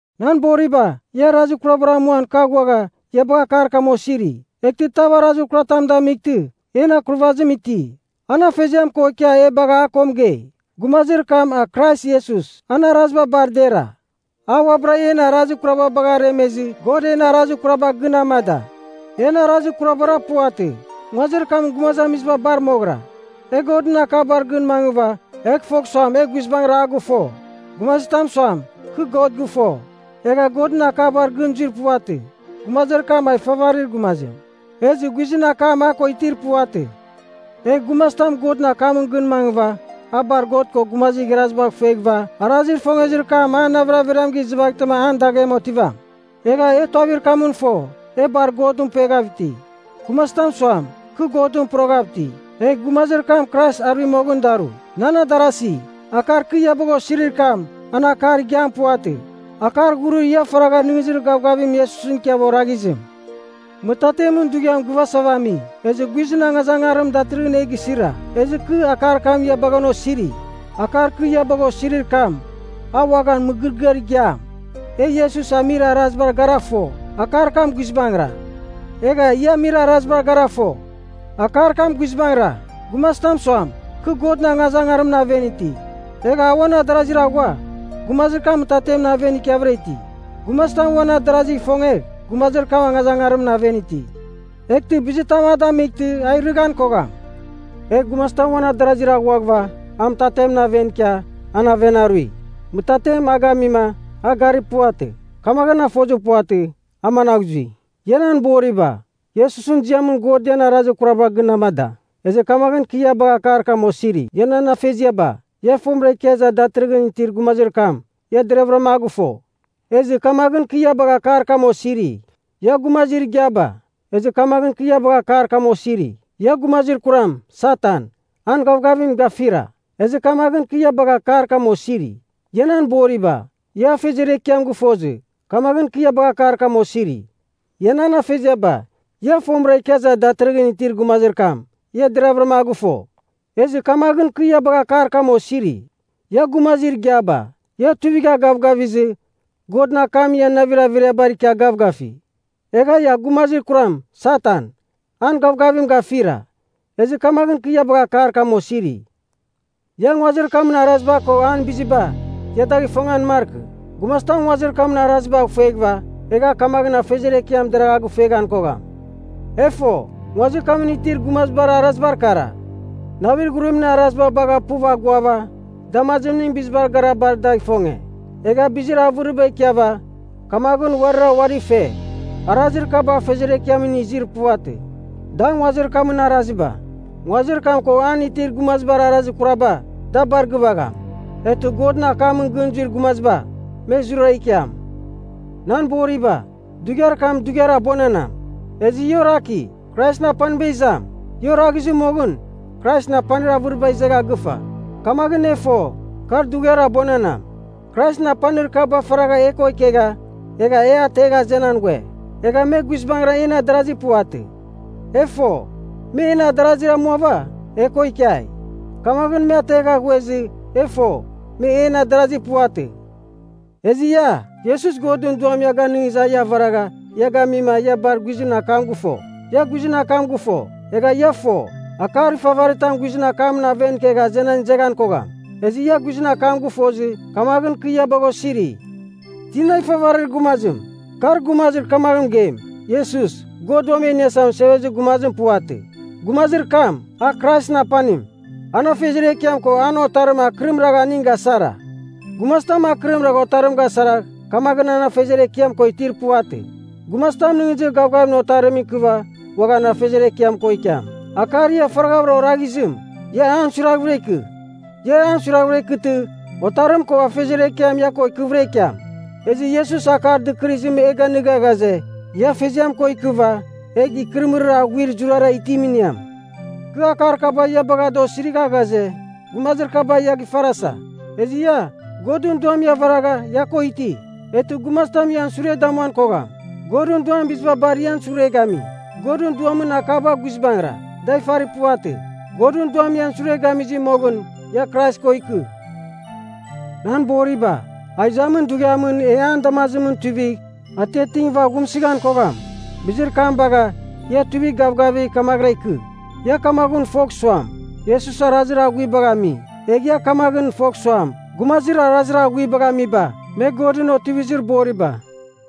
Nan boriba, ia arazir kurabar amuan kɨ aghuagha, ia bagha akar kam osiri. Eghtɨ tav arazir kuratam damightɨ, en akurvazim iti. An Afeziam ko ikia e bagha a ko mɨgei. Gumazir kam a Krais Iesus, an araziba bar dera. A uabɨra en arazir kuraba baghava aremezɨ God en arazir kuraba gɨn amada. En arazir kurabara puvatɨ, nguazir kamɨn gumazamiziba bar moghɨra. E Godɨn akabar gɨn mangɨva, egh fogh suam e guizbangɨra a gɨfo. Gumazitam suam, kɨ God gɨfo, egha Godɨn akabar gɨn zuir puvatɨ, gumazir kam a ifavarir gumazim. Ezɨ guizɨn akam a ko itir puvatɨ. Egh gumazitam Godɨn akamɨn gɨn mangɨva, a bar God ko gumazir igharazibagh ifueghɨva, arazir ifongezir kam an navir averiam gɨzɨvaghtɨma an daghem otivam. Egha e tuavir kamɨn fo, e bar Godɨn pueghav iti. Gumazitam suam, kɨ Godɨn poroghav iti, egh gumazir kam Krais arui moghɨn daru. Nan adarasi, akar kɨ ia bagha osirir kam, an akar igiam puvatɨ. Akar ghurir ia faragha nɨghnɨzir gavgavim Iesusɨn ikiava oraghizim. Mɨtatemɨn dughiam gɨvasava ami, ezɨ guizɨn angazangarim datɨrɨghɨn e gisira, ezɨ kɨ akar kam ia bagha an osiri. Akar kɨ ia bagha osirir kam, a uaghan mɨgɨrɨgɨar igiam. E Iesus amir arazibar gara fo, akar kam guizbangɨra. Egha ia amir araziba gara fo, akar kam guizbangɨra. Gumazitam suam, kɨ Godɨn angazangarimɨn aven iti, egha a uan adarazir aghua, gumazir kam mɨtatemɨn aven ikiavɨra iti. Gumazitam uan adarazigh ifongegh, gumazir kam angazangarimɨn aven iti, eghtɨ bizitam a damightɨ, a irɨghan kogham. Egh gumazitam uan adarazir aghuaghɨva, a mɨtatemɨn aven ikia, an aven arui. Mɨtatem a gamima, a garir puvatɨ. Kamaghɨn a fozir puvatɨ, a managh zui. Ia nan boriba, Iesusɨn ziamɨn God ian arazir kuraba gɨn amada, ezɨ kamaghɨn kɨ ia bagha akar kam osiri. Ia nan afeziaba, ia, fomɨra ikia iza datɨrɨghɨn itir gumazir kam, ia deravɨram a gɨfo. Ezɨ kamaghɨn kɨ ia bagha akar kam osiri. Ia gumazir igiaba, ia gumazir kuram, Satan, an gavgavim gafira. Ezɨ kamaghɨn kɨ ia bagha akar kam osiri. Ia nan boriba, ia Afeziar Ekiam gɨfozɨ, kamaghɨn kɨ ia bagha akar kam osiri. Ia nan afeziaba, ia, fomɨra ikia iza datɨrɨghɨn itir gumazir kam, ia deravɨram a gɨfo. Ezɨ kamaghɨn kɨ ia bagha akar kam osiri. Ia gumazir igiaba, ia tuivigha gavgavizɨ, Godɨn akam ian navir averiabar ikia gavgafi. Egha ia gumazir kuram, Satan, an gavgavim gafira. Ezɨ kamaghɨn kɨ ia bagha akar kam osiri. Ia nguazir kamɨn araziba ko an biziba, ia dagh ifongan markɨ. Gumazitam nguazir kamɨn arazibagh ifueghɨva, egh kamaghɨn an Afeziar Ekiam deragh a gɨfueghan kogham. E fo, nguazir kamɨn itir gumazibar arazibar kara: navir ghurimɨn araziba bagha puv aguava, damazimɨn bizibar gara bar dagh ifonge, egha bizir avɨriba ikiava, kamaghɨn uarira uari fe. Arazir kaba Afeziar Ekiamɨn izir puvatɨ. Da nguazir kamɨn araziba. Nguazir kam ko an itir gumazibar arazir kuraba, da bar gɨvagham. Eghtɨ Godɨn akamɨn gɨn zuir gumaziba, me zurara ikiam. Nan boriba, dughiar kam dughiar abuananam. Ezɨ ia oraki, Kraisɨn apaniba izam. Ia oraghizir moghɨn, Kraisɨn apanir avɨriba izegha gɨfa. Kamaghɨn e fo, kar dughiar abuananam. Kraisɨn apanir kaba faragha e ko ikegha, egha e ategha azenan ghue. Egha me guizbangɨra en adarazi puvatɨ. E fo, me en adarazi amuava, e ko ikiai. Kamaghɨn me ategha ghuezɨ, e fo, me en adarazi puvatɨ. Ezɨ ia, Iesus Godɨn Duam ia ganɨngizɨ a ia avaragha, ia gamima, ia bar guizɨn akam gɨfo. Ia guizɨn akam gɨfo, egha ia fo, akar ifavaritam guizɨn akamɨn aven ikegh azenan izeghan kogham. Ezɨ ia guizɨn akam gɨfozɨ, kamaghɨn kɨ ia bagha osiri. Tina ifavarir gumazim? Kar gumazir kamaghɨn mɨgeim, “Iesus, God Uam E Iniasa Mɨsevezir Gumazim puvatɨ.” Gumazir kam, a Kraisɨn apanim. An Afeziar Ekiam ko an Otarim akɨrim ragha aning gasara. Gumazitam akɨrim ragh Otarim gasaragh, kamaghɨn an Afeziar Ekiam ko itir puvatɨ. Gumazitam nɨghnɨzir gavgavim Otarimɨn ikɨva uaghan Afeziar Ekiam ko ikiam. Akar ia faraghavɨra oraghizim, ia an suiraghvɨra ikɨ. Ia an suiravɨra ikɨtɨ, Otarim ko Afeziar Ekiam ia ko ikɨvɨra ikiam. Ezɨ Iesus akar dɨkɨrɨzim e ganɨga ghaze, ia Afeziam ko ikɨva, egh ikɨrɨmɨrir aghuir zurara itim iniam. Kɨ akar kaba ia bagha da osirigha ghaze, gumazir kaba ia gifarasa. Ezɨ ia, Godɨn Duam ia avaragha, ia ko iti. Eghtɨ gumazitam ian sure damuan kogham. Godɨn Duam biziba bar ian sure gami. Godɨn Duamɨn akaba guizbangɨra, da ifari puvatɨ. Godɨn Duam ian sure gamizɨ moghɨn, ia Krais ko ikɨ. Nan boriba, a izamin dughiamɨn e an damazimɨn tuivigh, atiatingɨva aghumsɨghan kogham. Bizir kam bagh, ia tuivigh gavgavigh kamaghɨra ikɨ. Ia kamaghɨn fogh suam, Iesus arazir aghuibagh ami, egh ia kamaghɨn fogh suam, gumazir arazir aghuibagh amiba, me Godɨn otivizir boriba.